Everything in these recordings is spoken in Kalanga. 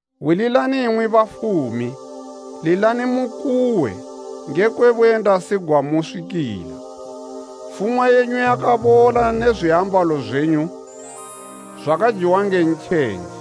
Hwililani imwi bafumi, lilani mukuwe ngekwe buyendasi gwamuswikila. Fumwa yenyu yakabola ne zwiambalo zwenyu zwakajiwa nge ntjenje.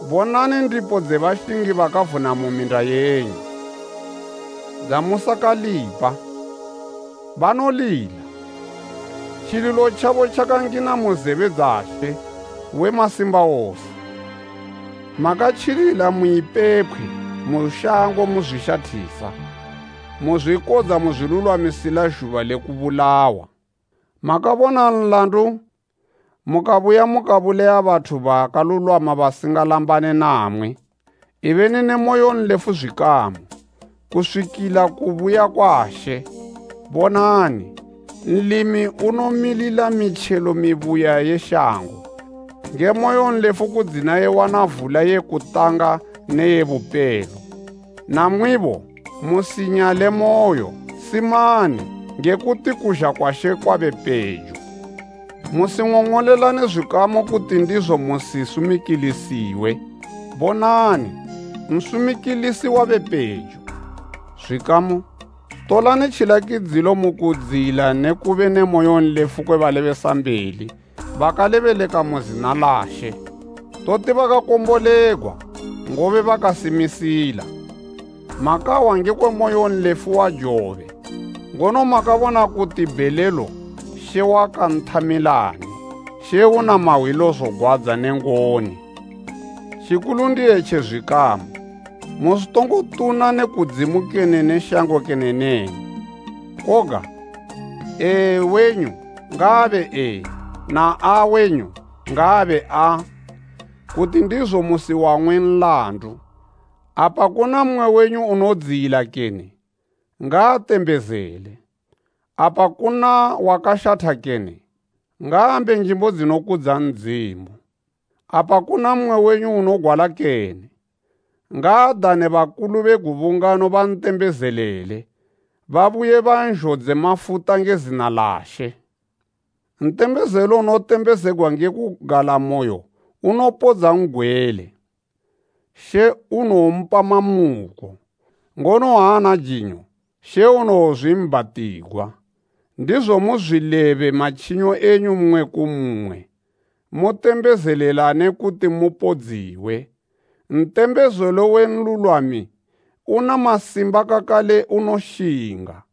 Bonani ndipo dze bashingi bakavuna mu minda yenyu, dzamusakalipa! Banolila. Tjililo tjabo tjakangina mu zebe dza She we masimba wose. 5Makatjilila mu ipepkhwe mu shango muzwishathisa. Muzwikodza muzwilulwamisila zhuba le kubulawa. Makabona nlandu mukabuya mukabulaya bathu bakalulwama basinga lambane namwi. Ibeni ne moyonlefu zwikamu, kuswikila kubuya kwa She. Bonani, nlimi unomilila mitjelo mibuya ye shango, nge moyonlefu kudzina iwana vula ye kutanga ne ye bupelo. Namwibo, musinyalemoyo, simani, nge kuti kuzha kwa She kwabe pejo. Musing'ong'olelane zwikamu kuti ndizo musisumikilisiwe. Bonani, Nsumikilisi wabe pejo. Zwikamu tolani tjilakidzilo mukudziyila nekube ne moyonlefu kwe balebesambeli bakalebeleka mu zina la She. Toti bakakombolegwa, ngobe bakasimisila. Makahwa ngekwe moyonlefu wa Jobe, ngono makabona kuti bhelelo She wakanthamilani. She una mahwilo zogwadza ne ngoni. Tjikulu ndi etji zwikamu, musitongo tuna ne kudzimu kene ne shango kene neni. Koga “Ee” wenyu ngaabe “Ee” na “Aa” wenyu ngaabe “Aa,” kuti ndizo musiwang'we nlandu. Apa kuna mmwe wenyu unodziyila kene? Ngaatembezele. Apa kuna wakashatha kene? Ngaambe njimbo dzinokudza Ndzimu. Apa kuna mmwe wenyu unogwala kene? Ngaadane bakulu be gubungano bantembezelele babuye banzhodze mafuta nge zina la She. Ntembezelo unotembezegwa nge kugalamoyo unowopodza n'gwele. She unowompa mamuko. Ngono ha ana jinyo She unowonzwiibhatigwa. Ndizo muzwilebe matjinyo enyu mmwe ku mmwe, mutembezelelane kuti mupodziwe. Ntembezelo we nlulwami una masimba kakale unoshinga.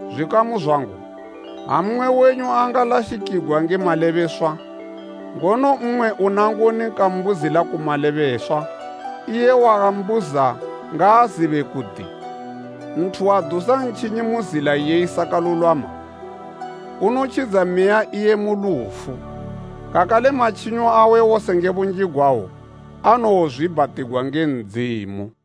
Zwikamu zwangu, ha mmwe wenyu angalashikigwa nge malebeswa, ngono mmwe una ngoni kambuzila ku malebeswa, Pita 4:8iye wambuza ngaazibe kuti, nthu wadusa ntjinyi mu zila iye isakalulwama, unotjidza meya iye mu lufu. Kakale matjinyo awe wose nge bunji gwawo anowozwiibhatigwa nge Ndzimu.